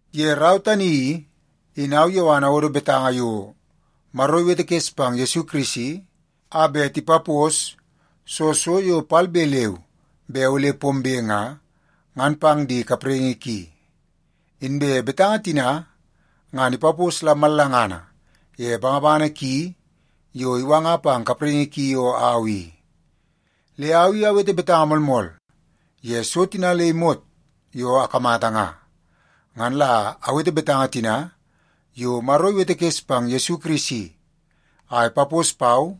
Ye rau tani i, in au Yowan awodo betanga yo Maro iwetekes pang Yesu Kirisi a bet ipapos soo so yo palbe leu be ole pombe nga, ngan pang di kapraingi ki. Inbe betanga tina ngan ipapos la mallangana ye bangabangana ki yo iwanga pang kapraingi ki yo au i. Le au i awete betanga moolmool ye so tina le imot yo akamata nga. Ngan la awete betanga tina yo Maro iwetekes pang Yesu Kirisi a ipapos pau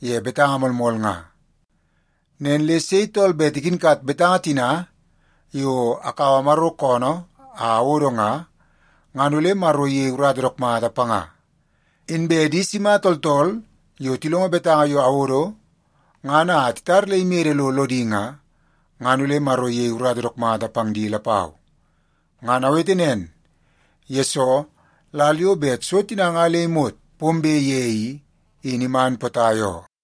ye betanga moolmool nga. Nen le sei tool bet ikinkat betanga tina yo akaua Maro koonoo a awodo nga, ngan ole Maro iyei urata dook mata panga. Inbe di sima tooltool yo tilongo betanga yo awodo ngan a titar le imede lo lodi nga, ngan ole Maro iyei urata dook mata pang di lapau. Ngan awete nen, yesoo lal yo bet so tina nga le imot pombe ye i, in iman potai oo.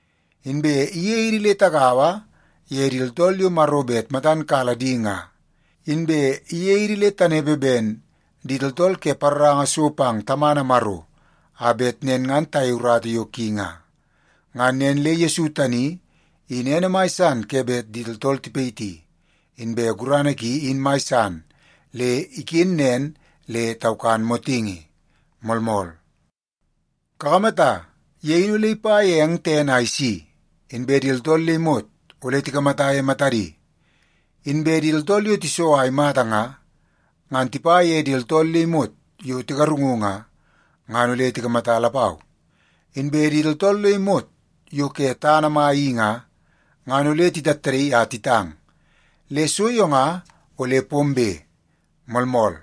Inbe iyei idi le tagaua ye di tooltool yo Maro bet matan kala di nga, inbe iyei idi le tanepe ben di tooltool ke paroranga so pang Tamana Maro, a bet nen ngan tayei urata yo ki nga. Ngan nen le Yesu tani in ene mai san ke bet di tooltool tipayiti, inbe gurana ki in mai san le iken nen le taukan motingi. Moolmool. Kakamata, ye in ole ipa ye eng tene a isi, inbe di tooltool le imot ole tikamata ye matadi. Inbe di tooltool yo tiso a imata nga, ngan tipa ye di tooltool le imot yo tigarungu nga, ngan ole tikamata lapau. Inbe di tooltool le imot yo ke tana mai i nga, ngan ole titattadaii a titang. Le so yo nga ole pombe. Moolmool.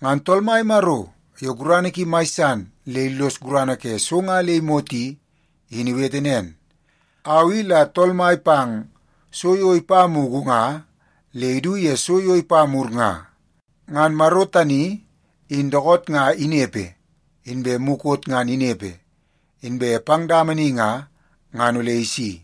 Ngan Tool Mai Maro yo gurana ki mai san le illos gurana ke so nga le imot i, in iwete nen, “Au i la Tool Mai pang so yo ipa mugu nga le idu ye so yo ipa mur nga.” Ngan Maro tani in dookoot nga inepe, inbe mukot ngan inepe, inbe pang dama ni nga, ngan ole isi.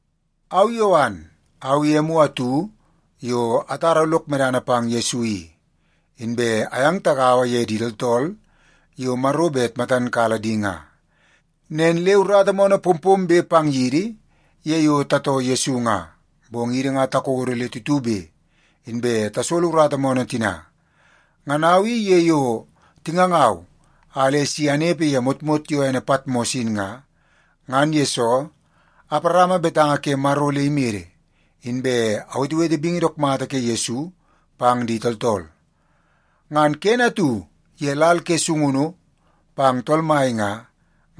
Au Yowan, au i emu atu yo atara lok medana pang Yesu i. Inbe ayang tagaua ye di tooltool yo Maro bet matan kala di nga. Nen le urata moonoo pompombe pang yidi ye yo tatoo Yesu nga, bong idi nga takodo le tutube, inbe tasolo urata moonoo tina. Ngan au i ye yo tingangau a le si anepe ye motmot yo ene Patmos in nga, ngan yesoo aparama betanga ke Maro le imede, inbe awetewete bingi dook mata ke Yesu pang di tooltool. Ngan kene atu ye lal ke sungunu pang Tool Mai nga,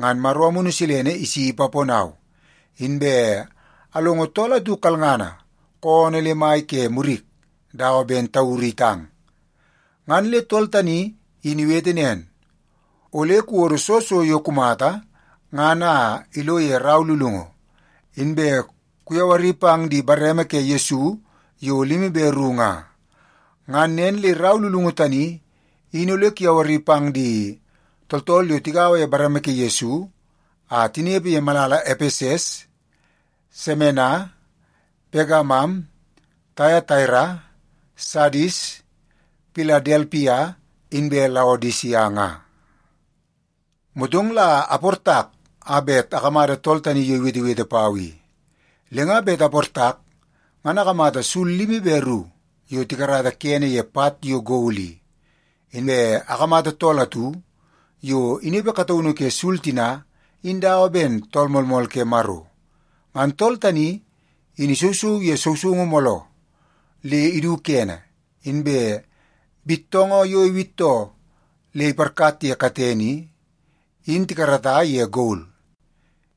ngan Maro Amunu Silene isi ipaponau, inbe alongo tool atu kalngana koonoo le mai ke murik dawa ben tauru itang. Ngan le tool tani in iwete nen, “Ole kuwodo soo so yo kumata ngan a ilo ye rau lulungu, inbe kuyawari pang di bareme ke Yesu yo limi be ru nga. Ngan nen le rau lulungu tani in ole kuyawari pang di tooltool yo tigaua ye bareme ke Yesu a tinepe ye malala Epeses, Semena, Pegamam, Taiataira, Sadis, Piladelpia inbe Laodisia nga.” Motong la aportak a bet akamata tool tani yo iwetewete pau i. Le nga bet aportak, ngan akamata sul limi be ru yo tikarata kene ye pat yo gol i. Inbe akamata tool atu yo inepe kataunu ke sul tina in dawa ben Tool Moolmool ke Maro. Ngan tool tani in isousou ye sousoungu mooloo le idu kene, inbe bittoongoo yo iwittoo le iparkat ye katene i, in tikarata ye gol.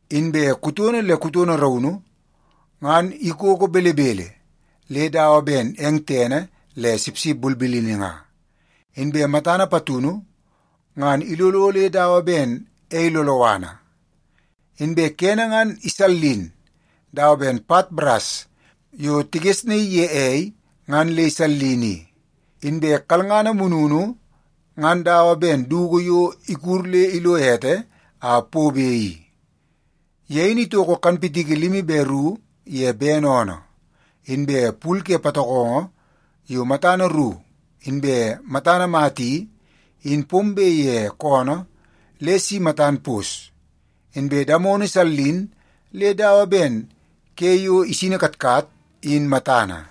Inbe kutono le kutono raunu, ngan ikoko belebele le dawa ben eng tene le sipsip bulbulini nga. Inbe matana patunu, ngan ilolo le dawa ben ei loloana. Inbe kene ngan isallin dawa ben pat baras yo tigesnaii ye ei ngan le isallin i. Inbe kalngana mununu ngan dawa ben dugu yo ikud le lo ete a pobe i. Ye in itoko kanpitiki limi be ru ye bene oonoo. Inbe pul ke patokongo yo matana ru inbe matana mata i, in pombe ye koonoo le si matan pos. Inbe damono isallin le dawa ben ke yo isini katkat in matana.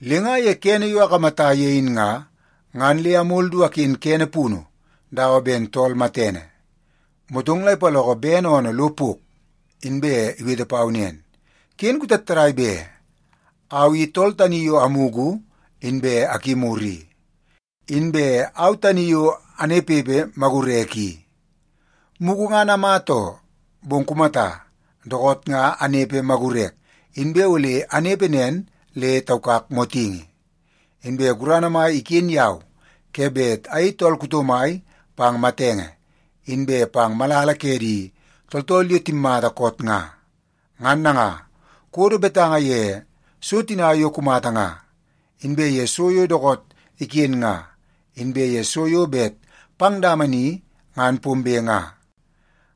Le nga ye kene yo akamata ye in nga, ngan le amol du aken kene punu dawa ben tool matene. Motong la ipaloko bene oonoo lo pok, inbe iwete pau nen, “Ken kutattadai be! Au i tool tani yo amugu inbe akimur i, inbe au tani yo anepepe magurek i. Mugu ngan amata oo, bong kumata, dookoot nga anepe magurek, inbe ole anepe nen le taukak motingi. Inbe gurana mai iken yau ke bet ayei tool kuto mai pang matenge, inbe pang malala ke di tooltool yo timmata koot nga. “Ngan nanga, kuwodo betanga ye so tina yo kumata nga, inbe ye so yo dookoot iken nga, inbe ye so yo bet pang dama ni ngan pombe nga.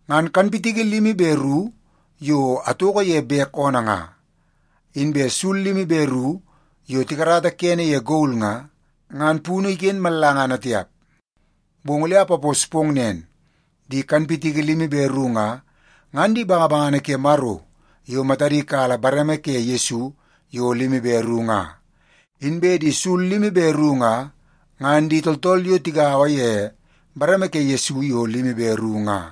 Ngan kanpitiki limi be ru yo atoko ye bek oonoo nga, inbe sul limi be ru yo tikarata kene ye gol nga, ngan punu iken mallangana tiap, bong ole apapos pong nen. Di kanpitiki limi be ru nga, ngan di bangabangana ke Maro yo matadi kala bareme ke Yesu yo limi be ru nga. Inbe di sul limi be ru nga, ngan di tooltool yo tigaua ye bareme ke Yesu yo limi be ru tina nga.”